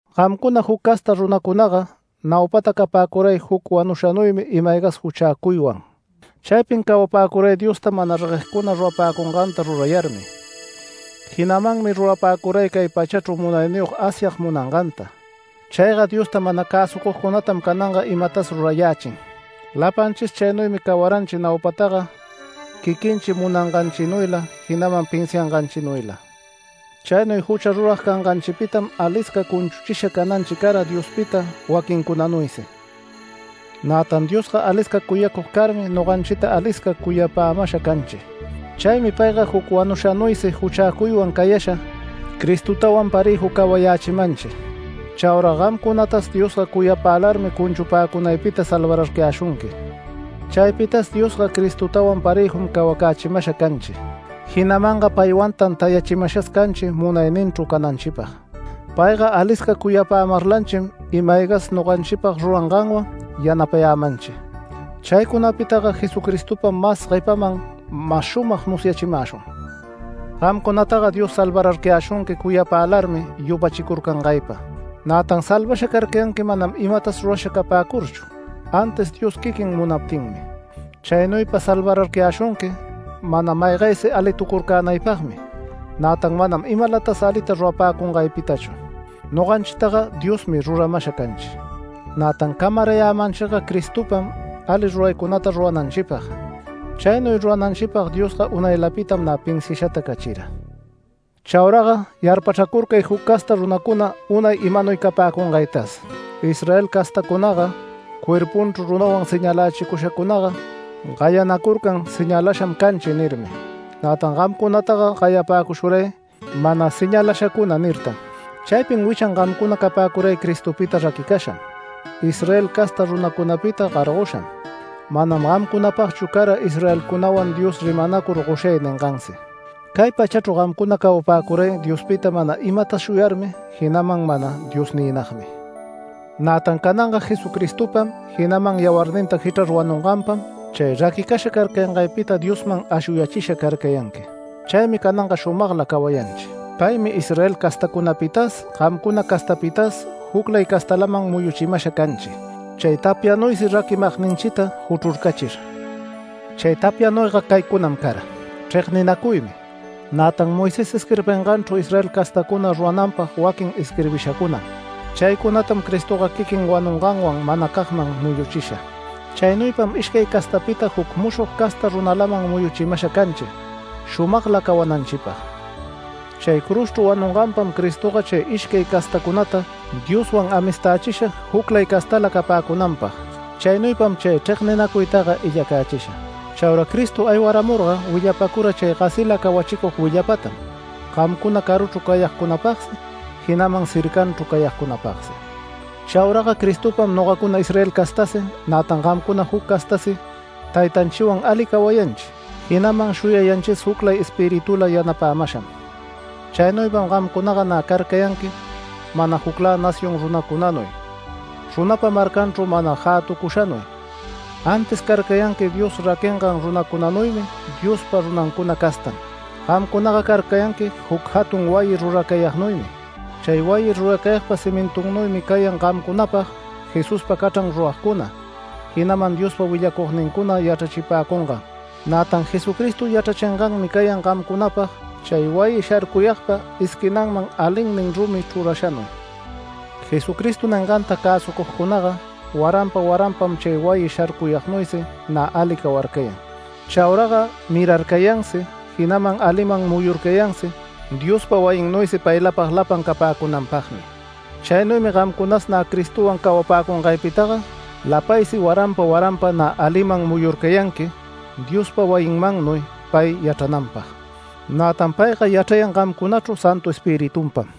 Gamcuna juc casta runacunaga naupata capäcuray juc wanushanuymi ima-aygas juchäcuywan. Chaypin cawapäcuray Diosta mana reguegcuna rurapäcunganta rurayarmi. Jinamanmi rurapäcuray cay pachachru munayniyog Asyag munanganta. Chayga Diosta mana cäsucugcunatam cananga imatas rurayächin. Lapanchis chaynuymi cawaranchi naupataga quiquinchi munanganchinuyla, jinaman pinsianganchinuyla. Chaynuy jucha rurag canganchipitam alisca cunchuchisha cananchi cara Diospita waquincunanuysi. Nätan Diosga alisca cuyacug carmi noganchita alisca cuyapämasha canchi. Chaymi payga juc wanushanuysi juchäcuywan cayasha, Cristotawan parëju cawayächimanchi. (Chaura gamcunatas Diosga cuyapälarmi cunchupäcunaypita salvararcayäshunqui.) Chaypitas Diosga Cristotawan parëjum cawacachimasha canchi, jinamanga paywantan tayachimashas canchi munayninchru cananchipag. Payga alisca cuyapämarlanchim ima-aygas noganchipag ruranganwan yanapayämanchi. Chaycunapitaga Jesucristopam mas guepaman mas shumag musyachimäshun. Gamcunataga Dios salvararcayäshunqui cuyapälarmi yupachicurcangaypa. Nätan salvasha carcayanqui manam imatas rurasha capäcurchu, antis Dios quiquin munaptinmi. Chaynuypa salvararcayäshunqui mana maygaysi alitucurcänaypagmi, nätan manam imalatas alita rurapäcungaypitachu. Noganchitaga Diosmi ruramasha canchi, nätan camarayämanchiga Cristopam ali ruraycunata rurananchipag. Chaynuy rurananchipag Diosga unaylapitam nä pinsiashata cachira. Chauraga yarpachracurcay juc casta runacuna unay imanuy capäcungaytas. Israel castäcunaga, cuerpunchru runawan señalächicushacunaga gayanacurcan “Señalasham canchi” nirmi, nätan gamcunataga gayapäcushuray “Mana señalashacuna” nirtan. Chaypin wichan gamcunaga capäcuray Cristopita raquicasham, Israel casta runacunapita gargosham, manam gamcunapagchu cara Israelcunawan Dios rimanacur “Goshay” ningansi. Cay pachachru gamcuna cawapäcuray Diospita mana imatas shuyarmi, jinaman mana Diosniynagmi. Nätan cananga Jesucristopam, jinaman yawarninta jichrar wanunganpam chay raquicasha carcayangaypita Diosman ashuyachisha carcayanqui. Chaymi cananga shumagla cawayanchi. Paymi Israel castacunapitas gamcuna castapitas juclay castalaman muyuchimasha canchi, chay tapyanuysi raquimagninchita juchrurcachir. Chay tapyanuyga caycunam cara: chregninacuymi, nätan Moisés isquirbinganchru Israel castacuna rurananpag waquin isquirbishacunam. Chaycunatam Cristoga quiquin wanunganwan manacagman muyuchisha. Chaynuypam ishcay castapita juc mushog casta runalaman muyuchimasha canchi, shumagla cawananchipag. Chay cruzchru wanunganpam Cristoga chay ishcay castacunata Dioswan amistächisha juclay castala capäcunanpag. Chaynuypam chay chregninacuytaga illacächisha. Chaura Cristo aywaramurga willapacura chay gasila cawachicug willapatam, gamcuna caruchru cayagcunapagsi, jinaman cercanchru cayagcunapagsi. Chauraga Cristopam nogacuna Israel castasi, nätan gamcuna juc castasi Taytanchiwan ali cawayanchi, jinaman shuyayanchis juclay Espiritula yanapämasham. Chaynuypam gamcunaga nä carcayanqui mana juclä nación runacunanuy, runapa marcanchru mana jätucushanuy, antis carcayanqui Dios raquingan runacunanuymi, Diospa runancuna castam. Gamcunaga carcayanqui juc jatun wayi ruracayagnuymi. Chay wayi ruracayagpa cimintunnuymi cayan gamcunapag Jesuspa cachran ruragcuna, jinaman Diospa willacugnincuna yachrachipäcungan. Nätan Jesucristo yachrachinganmi cayan gamcunapag chay wayi sharcuyagpa esquinanman alinnin rumi chrurashanuy. Jesucristo ninganta cäsucugcunaga waranpa waranpam chay wayi sharcuyagnuysi nä ali cawarcayan. Chauraga mirarcayansi, jinaman aliman muyurcayansi Diospa wayinnuysi paylapag lapan capäcunanpagmi. Chaynuymi gamcunas nä Cristowan cawapäcungaypitaga lapaysi waranpa waranpa nä aliman muyurcayanqui Diospa wayinmannuy pay yachrananpag. Nätan payga yachrayan gamcunachru Santu Espiritunpam.